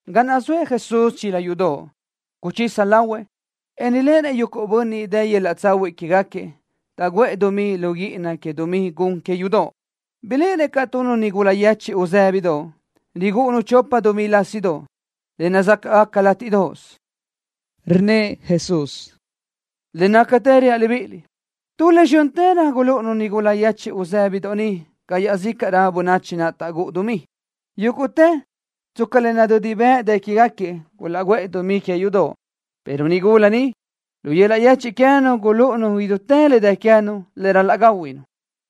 Ga naʼ zoëʼ Jesús chila yudoʼ, guchisa lahuëʼ, en riléʼenëʼ yuguʼ bönniʼ dë yöl-laʼ tsahuiʼ quégaquiëʼ, taʼguʼë dumí lu guíʼina que dumí gun que yudoʼ. Biléʼenëʼ caʼ tu nigula yechiʼ uzë́bidoʼ, rigúʼunu chopa dumí lásidoʼ, le nazácaʼgaca látiʼdoʼos. Rnnëʼ Jesús: —Le nácatë reaʼ libíʼiliʼ, tu le zxö́ntërö gulúʼunu nigula yechiʼ uzë́bidoʼ ni ca iaʼzícaʼrö bönachi naʼ taʼguʼë dumí. Yúguʼtëʼ, tsca le nadödi bëʼ dë quégaquiëʼ, gulaʼguʼë dumí que yudoʼ, pero nigula ni, lu yöl-laʼ yechiʼ queë́nu gulúʼunu idútë le dë queë́nu, le ral-laʼ gáhuinu.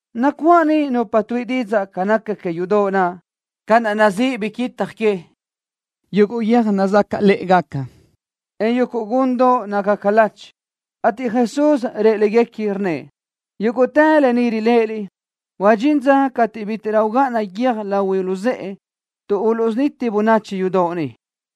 Nacuáʼ niʼ nupa tuíʼi didzaʼ ca naca que yudoʼ naʼ, ca naʼ nazíʼi biquitaj que, yuguʼ guiö́j nazácalëʼegaca, en yuguʼ gundoʼ nácagaca lachi, ateʼ Jesús rëʼ légaquiëʼ, rnnëʼ: —Yúguʼtë lë ni riléʼeliʼ, huadxín dza cateʼ bítiʼrö ugáʼana guiö́j lahui luzë́ʼe ni, tuʼ uluʼsuniti bönachi yudoʼ ni.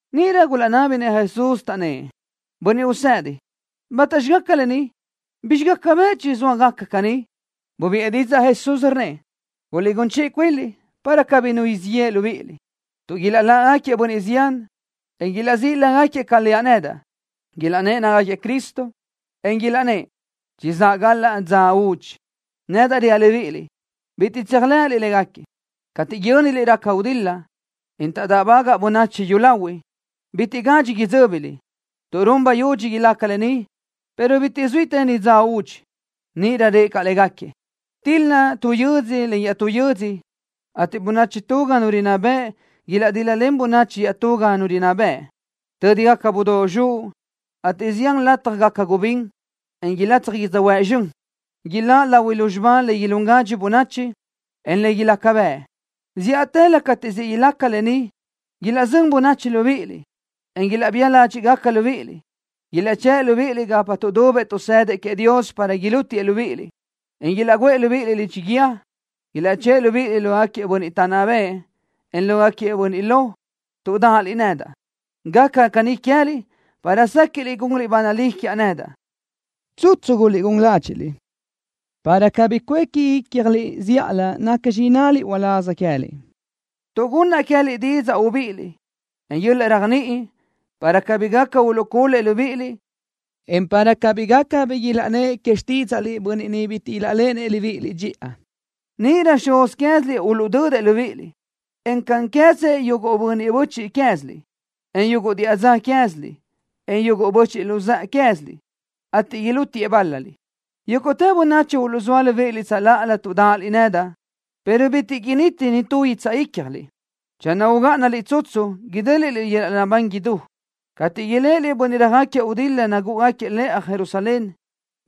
Níʼirö gulaʼnábinëʼ Jesús, taʼnnë́ʼ: —Bönniʼ Usedi, ¿bátaxi gaca lë ni? ¿Bizxi gaca bëʼ chizóa gaca caní? Bubiʼë didzaʼ Jesús, rnnëʼ: —Guliʼgún chiʼi cuinliʼ, para cabí nu siʼ yeʼe libíʼiliʼ, tuʼ ilaʼláʼgaquiëʼ bönniʼ zián, en ilaʼzíʼi lágaquiëʼ ca leaʼ nedaʼ, ilaʼnnë́ʼ nácagaquiëʼ Cristo, en ilaʼnnë́ʼ: “Chizáʼ galaʼ dza údxi.” Nedaʼ reaʼ libíʼiliʼ: Bitiʼ tséajlenliʼ légaquiëʼ. Cateʼ yö́niliʼ raca gudil-la, en taʼdáʼbagaʼ bönachi yúlahuiʼ, bitiʼ gadxi idzö́biliʼ, tuʼ run bayudxi ilaca le caní, pero bitiʼ zuítëni dza údxi. Níʼirö rëʼ caʼ légaquiëʼ: —Til-la tu yödzö len iaʼtú yödzö, ateʼ bönachi tu ga nu rinná bëʼ ilaʼdíl-lalen bönachi iaʼtú ga nu rinná bëʼ. Tö́digaca budóʼ zxuʼ, ateʼ zián lataj gaca gubín, en ilatsaj yödzöhuë́ʼ zxön. Ilaʼláʼ lahui lúzxiba le ilún gadxi bönachi, en le ilaca bëʼ. ’Zíʼatëlö cateʼ siʼ ilaca lë ni, ilaʼzö́n bönachi libíʼiliʼ, en ilaʼbía ládxiʼgaca libíʼiliʼ. Ilaʼchë́ʼë libíʼiliʼ gapa tuʼdubëʼ tuʼsëdëʼ queëʼ Dios para ilútiëʼ libíʼiliʼ, en ilaʼguʼë libíʼiliʼ lidxi guíë. Ilaʼchë́ʼë libíʼiliʼ lógaquiëʼ bönniʼ taʼnná bëʼë, en lógaquiëʼ bönniʼ lo, tuʼ dáʼaliʼ nedaʼ. Gaca caní queë́liʼ para séquiʼliʼ gunliʼ ba nalí quiaʼ nedaʼ. Tsutsu guliʼgún ládxiʼliʼ, para cabí cuéqui ícjaliʼ zíʼalö nacxi innaliʼ uláz queë́liʼ, tuʼ gunnaʼ queë́liʼ didzaʼ ubíʼiliʼ, en yöl-laʼ réajniʼi, para cabí gaca uluʼcul-lëʼ libíʼiliʼ, en para cabí gaca bi ilaʼnnë́ʼ que xtídzaʼliʼ bönniʼ niʼ bitiʼ ilaʼléʼenëʼ libíʼiliʼ dxiʼa. Níʼirö xuz quéziliʼ uluʼdödëʼ libíʼiliʼ, en cáʼanqueze yuguʼ bönniʼ böchiʼ quéziliʼ, en yuguʼ diʼa dza que quéziliʼ, en yuguʼ böchiʼ luzë́ʼe quéziliʼ, ateʼ ilútiëʼ bál-laliʼ. Yúguʼtë bönachi uluʼzóa libíʼiliʼ tsöláʼalö tuʼ dáʼaliʼ nedaʼ, pero bitiʼ initi nitú guitsaʼ ícjaliʼ. Channö ugáʼanaliʼ tsutsu, idéliʼliʼ yöl-laʼ naʼbán idú. ’Cateʼ iléʼeliʼ bönniʼ röjáquiëʼ gudil-la nagúʼugaquiëʼ lëʼa Jerusalén,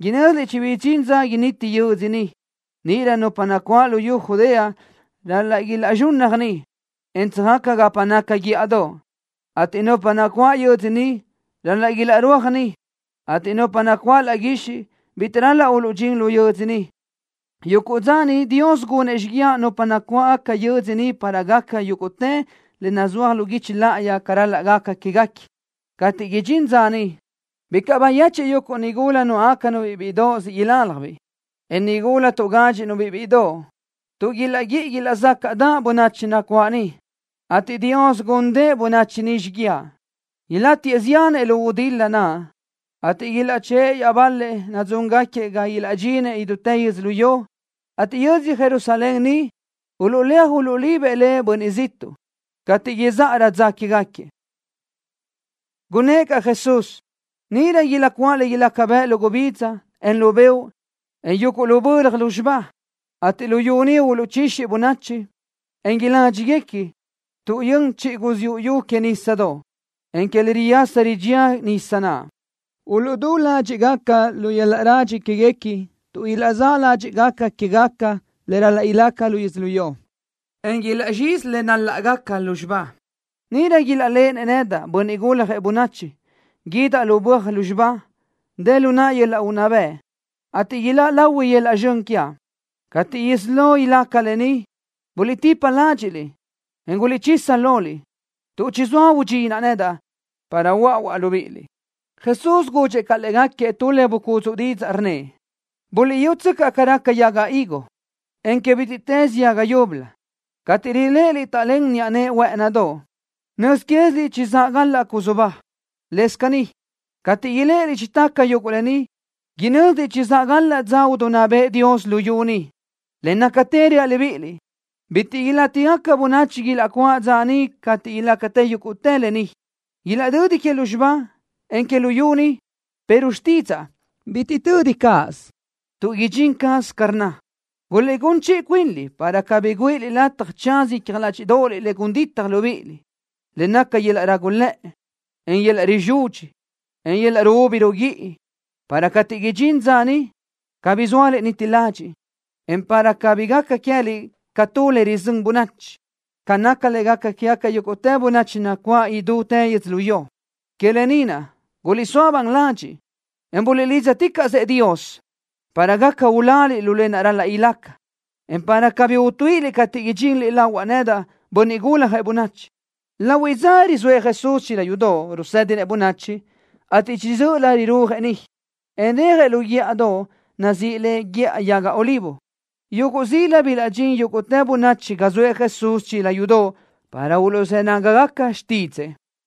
inö́ziliʼ chibidxín dza initi yödzö ni. Níʼirö nupa nacuáʼ luyú Judea ral-laʼ ilaʼzxunnaj ni, en tsöjaca gapa naca guíʼadoʼ, ateʼ nupa nacuáʼ lu yödzö ni ral-laʼ ilaʼrúaj ni, ateʼ nupa nacuáʼ laʼ guixiʼ, bitiʼ ral-laʼ uluʼdxín lu yödzö ni. Yuguʼ dza niʼ Dios gunëʼ xíguiaʼ nupa nacuáʼ yödzö ni para gaca yúguʼtë le nazúaj lu guichi láʼayi ca ral-laʼ gaca quégaquiëʼ. Cateʼ idxín dza niʼ, bicaʼ bayechiʼ yuguʼ nigula nuáʼgacanu-biʼ bíʼidoʼ siʼ ilaljbiʼ, en nigula tuʼgádxiʼnu-biʼ bíʼidoʼ, tuʼ ilaʼguíʼi ilaʼzácaʼdaʼ bönachi nacuáʼ niʼ, ateʼ Dios gúndëʼë bönachi niʼ xíguiaʼ. Ilátiëʼ ziánëʼ lu gudil-la naʼ, ateʼ ilaʼchë́ʼë iaʼbal-lëʼ nadzúngaquiëʼ ga ilaʼdxinëʼ idútë yödzölió, ateʼ yödzö Jerusalén ni, uluʼléaj uluʼlibëʼ le bönniʼ ziʼtuʼ, cateʼ izáʼarö dza quégaquiëʼ. Gunnë́ʼ caʼ Jesús: —Niʼirö ilaʼcuáʼ le ilaca bëʼ lu gubidza, en lu beoʼ, en yuguʼ lu bölaj lúzxiba, ateʼ luyú ni uluʼchixi bönachi, en iládxiguequi, tuʼ yön chiʼi guziúʼ yu que nísadoʼ, en que le riyasa ridxía nisa naʼ. Uluʼdú ládxiʼgaca lu yöl-laʼ radxi quéguequi tuʼ ilaʼzáʼ ládxiʼgaca quégaca le ral-laʼ ilaca lu yödzölió, en ilaʼzxizi le naláʼgaca lúzxiba. Níʼirö ilaʼléʼenëʼ nedaʼ, Bönniʼ Guljëʼ Bönachi, guídaʼ lu böaj lúzxiba, dë lu naʼa yöl-laʼ unná bëʼ, ateʼ iláʼ lahui yöl-laʼ zxön quiaʼ. Cateʼ isí lo ilaca lë ni, buliʼtipa ládxiʼliʼ, en guliʼchisa loliʼ, tuʼ chizóa udxinaʼ nedaʼ, para huöáʼuaʼ libíʼiliʼ. Jesús gudxëʼ caʼ légaquiëʼ tu le bucúdzuʼë didzaʼ, rnnëʼ: —Buliʼyútsöcaʼ ca raca que yaga higo, en que bítiʼtës yaga yúbölö. Cateʼ riléʼeliʼ taʼlén niʼa nëʼe huë́ʼënidoʼ, nöz quéziliʼ chizáʼ galaʼ cusu ba. Lëscaʼ caní, cateʼ iléʼeliʼ chitaca yuguʼ lë ni, inö́ziliʼ chizáʼ galaʼ dza idinná bëʼë Dios luyú ni. ’Le nácatë reaʼ libíʼiliʼ, bitiʼ ilátigaca bönachi ilaʼcuáʼ dza niʼ cateʼ ilaca yúguʼtë lë ni. Ilaʼdödi que lúzxiba, en que luyú ni, pero xtídzaʼa, bitiʼ tödi cáʼasö, tuʼ idxín caz ca rnna. ’Guliʼgún chiʼi cuinliʼ para cabí güíʼiliʼ lataj tsaza icja ládxiʼdoʼoliʼ le gun ditaj libíʼiliʼ, lë naʼ naca yöl-laʼ rágulëʼe, en yöl-laʼ rizudxi, en yöl-laʼ ruúbi ruguíʼi, para cateʼ idxín dza niʼ, cabí sóaliʼ niti ladxiʼ, en para cabí gaca queë́liʼ ca tu le rizö́n bönachi, ca naca le gaca quégaca yúguʼtë bönachi nacuáʼ idútë yödzölió. Que lë ni naʼ, guliʼsóa ban ladxiʼ, en buliʼlídzaticaʼsëʼ Dios, para gaca uláliʼ lu lë naʼ ral-laʼ ilaca, en para cabí utuíʼiliʼ cateʼ idxinliʼ lahuaʼ nedaʼ, Bönniʼ Guljëʼ Bönachi. Lahuiʼ dza rizóëʼ Jesús chila yudoʼ, rusédinëʼ bönachi, ateʼ chiʼi dzö́ʼölö rirúajëʼ niʼ, en rejëʼ lu guíʼadoʼ nazíʼi le Guíʼa Yaga Olivo. Yuguʼ zila bilaʼdxín yúguʼtë bönachi ga zoëʼ Jesús chila yudoʼ para uluʼzë́ nágagaca xtídzëʼë.